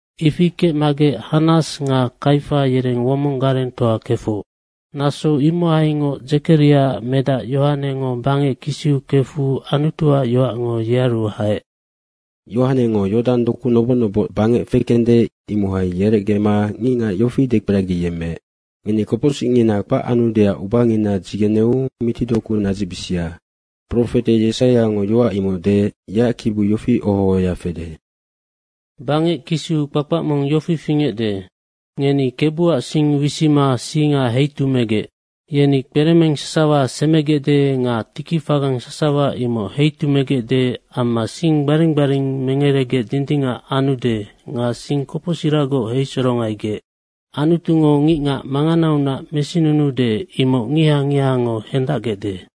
Ifi kecmagec Hannas nga Kaifa yereng womong garengtoa kefoc. Naso imohaingoc Dzekariaac medac Yohanengo bangec kisiu kefu Anutuac yoacngo yearu haec. Yohanengo Yodang doku noboc noboc bangec fekende, imohai yerecgema ngicngac yofi dekperagiyemmeec, “Ngeni kopocsicngina kpac anudeac ubangina dzigeneu mitidoku nadzicbisia.” Profete Yesaiango yoac imoc deec, yeac kibiu yofi oho ohoya fede, “Bangec kisiu kpakpac mong yofi fingecde, ‘Ngeni Kebuac sing wisima singa heitumegec. Yeni kperemeng sasawa semegecde nga tikifagang sasawa imoc heitumegecde amma sing gbaring gbaring mengeregec dindingac anude nga sing kopocsiragoc heisorongaigec Anutungo ngicngac manganaunac mesinunuude, imoc ngiha ngihango hendacgecde.’”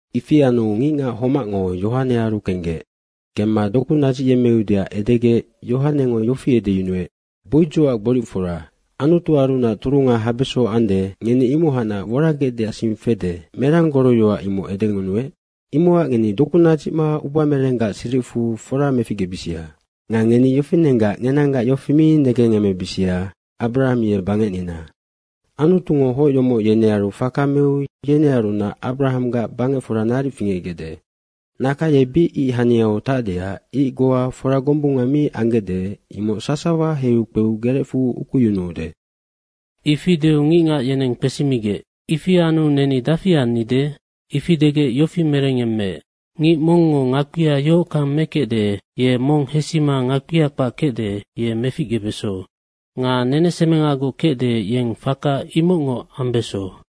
Ifi anu ngicngac homacngo Yohanearu kenggec. Kemma doku nadzicyemmeudeac edegec Yohanengo yofi edeyunuec, “Boidzocac gboricfora, Anutuarunac turunga habeso ande, ngeni imohacnac woragecdeac sing fede, merang goroyoac imoc edengunuec? Imocac ngeni doku nadzicma ubamerenggac siricfu fora meficgebisia. Nga ngeni yofinenggac ngenanggac yofi mi negengemebisia, ‘Abrahang ye bangecnina.’ Anutungo hoc yomoc yenearu faka meu yenearunac Abrahanggac bangecfora naric fingecgecde. Naka ye bic ic haniau tacdeac ic goa fora gombunga mi anggecde, imoc sasawa heiu kpeu gerecfu ukuyunuude.” Ifi deu ngicngac yeneng kpesimigec, “Ifi anu neni dafi annide?” Ifi degec yofi merengyemmeec, “Ngic mongngo ngakpia yohockang mekecde, ye mong hesima ngakpia kpac kecde, ye meficgebeso. Nga nenesemengagoc kecde, yeng faka imocngoc ambeso.”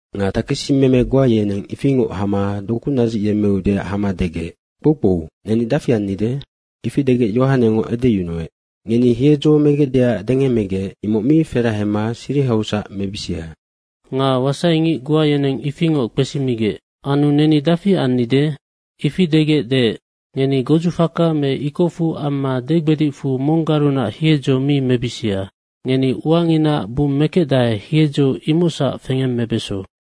Nga takesimeme goa yeneng ifingoc hama doku nadzicyemmeudeac hama degec, “Kpoukpou, neni dafi annide?” ifi degec Yohanengo edeyunuec, “Ngeni hiedzo megecdeac dengemmegec, imoc mi ferahema sirihausac mebisia.” Nga wasaingic goa yeneng ifingoc kpesimigec, “Anu neni dafi annide?” Ifi degec deec, “Ngeni godzufaka me ikocfu amma degbedicfu monggarunac hiedzo mi mebisia. Ngeni uanginaac bummekecdae, hiedzo imocsac fengemmebeso.”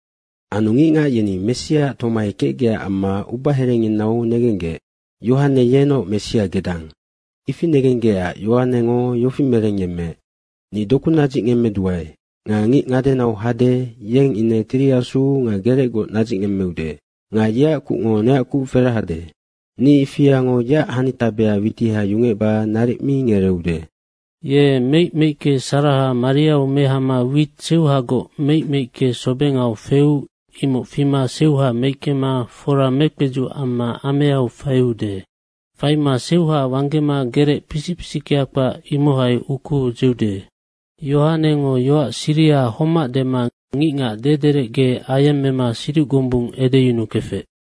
Anu ngicngac yeni Messiaac tomai kecgecac amma ubaherenginau negenggec, “Yohane yenoc Messia gedang.” Ifi negenggecac Yohanengo yofi merengyemmeec, “Ni doku nadzicngemmeduae nga ngic ngadenau hade, yeng ine Tiri Asu nga gerecgoc nadzicngemmeude. Nga yeac kucngo neac kuc ferahade, ni ifiango yeac hanitabea witiha yungecba naric mi ngereeude. Ye meic meicke saraha mariau mehama wit seuhagoc meic meicke sobengau feu, imoc fima seuha meickema fora mekpedzuc amma ameau faiude. Faima seuha wanggema gerec pisic pisickea kpac, imohai ukuu dzeude.” Yohanengo yoac siriha homac dema ngicngac dederecge ayemmema siduc gombung edeyunukefec.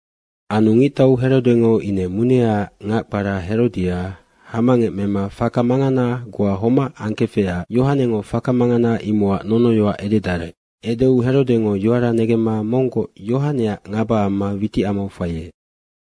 Anu ngictau Herodengo ine muneaac ngac kpara Herodia hamangec mema faka mangana goa homac angkefecac Yohanengo faka mangana imocac nonoyoac ededarec. Edeu Herodengo yoara negemma monggoc Yohaneac ngaba amma witicamau faiec.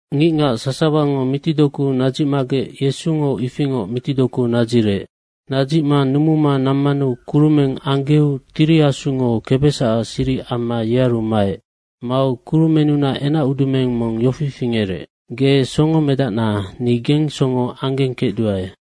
Ngicngac sasawango mitidoku nadzicmagec Yesungo ifingoc mitidoku nadzirec. Nadzicma numuma nammanu kurumeng anggeu Tiri Asungo kebesacac siric amma yearu maec. Mau kurumennunac enacudumeng mong yofi fingerec, “Ge songomedacna, ni gengsongo anggengkecduae.”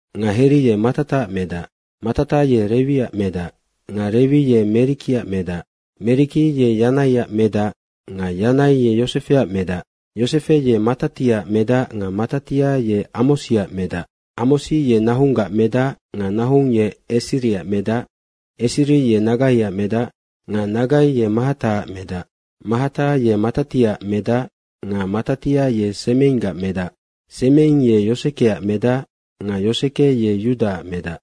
nga Heri ye Matataac medac. Matata ye Rewiac medac nga Rewi ye Merikiac medac. Meriki ye Yanaiac medac nga Yanai ye Yosefeac medac. Yosefe ye Matatiaac medac nga Matatia ye Amosiac medac. Amosi ye Nahunggac medac nga Nahung ye Esiriac medac. Esiri ye Nagaiac medac nga Nagai ye Mahataac medac. Mahata ye Matatiaac medac nga Matatia ye Semeinggac medac. Semeing ye Yosekeac medac nga Yoseke ye Yudaac medac.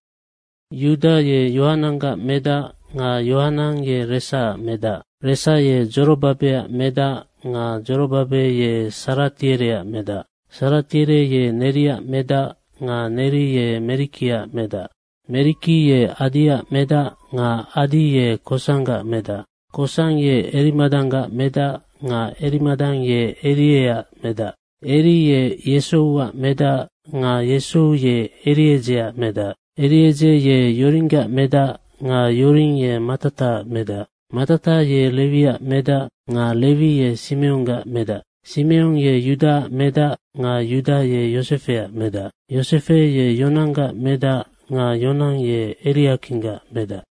Yuda ye Yohananggac medac nga Yohanang ye Resaac medac. Resa ye Dzorobabeac medac nga Dzorobabe ye Saratiereac medac. Saratiere ye Neriac medac nga Neri ye Merikiac medac. Meriki ye Adiac medac nga Adi ye Kosanggac medac. Kosang ye Erimadanggac medac nga Erimadang ye Erieac medac. Eri ye Yesouac medac nga Yesou ye Eriedzeac medac. Eriedze ye Yoringgac medac nga Yoring ye Matataac medac. Matata ye Rewiac medac nga Rewi ye Simeonggac medac. Simeong ye Yudaac medac nga Yuda ye Yosefeac medac. Yosefe ye Yonanggac medac nga Yonang ye Eriakinggac medac.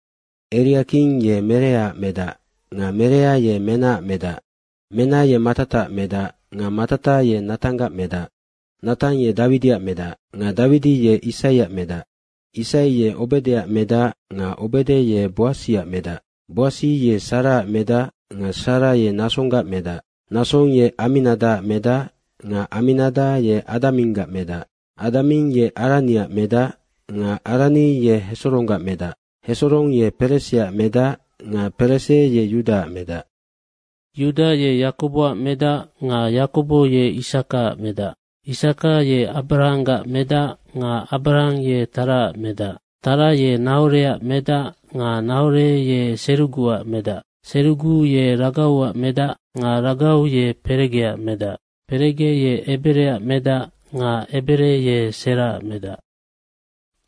Eriaking ye Mereaac medac nga Merea ye Menaac medac. Mena ye Matataac medac nga Matata ye Natanggac medac. Natang ye Dawidiac medac nga Dawidi ye Isaiac medac. Isai ye Obedeac medac nga Obede ye Boasiac medac. Boasi ye Saraac medac nga Sara ye Nasonggac medac. Nasong ye Aminadaac medac nga Aminada ye Adaminggac medac. Adaming ye Araniac medac nga Arani ye Hesoronggac medac. Hesorong ye Pereseac medac nga Perese ye Yudaac medac. Yuda ye Yakoboac medac nga Yakobo ye Isakaac medac. Isaka ye Abrahanggac medac nga Abrahang ye Taraac medac. Tara ye Nahoreac medac nga Nahore ye Seruguac medac. Serugu ye Ragauac medac nga Ragau ye Peregeac medac. Perege ye Ebereac medac nga Ebere ye Seraac medac.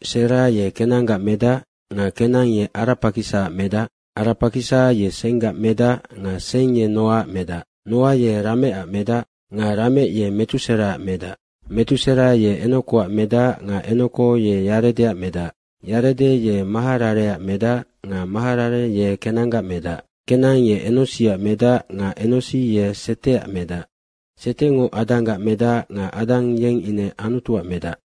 Sera ye Kenanggac medac nga Kenang ye Arapakisaac medac. Arapakisa ye Senggac medac nga Seng ye Noaac medac. Noa ye Rametac medac, nga Ramec ye Metuseraac medac. Metusera ye Enokoac medac nga Enoko ye Yaredeac medac. Yarede ye Maharareac medac nga Maharare ye Kenanggac medac. Kenang ye Enosiac medac nga Enosi ye Seteac medac. Setengo Adanggac medac nga Adang yeng ine Anutuac medac.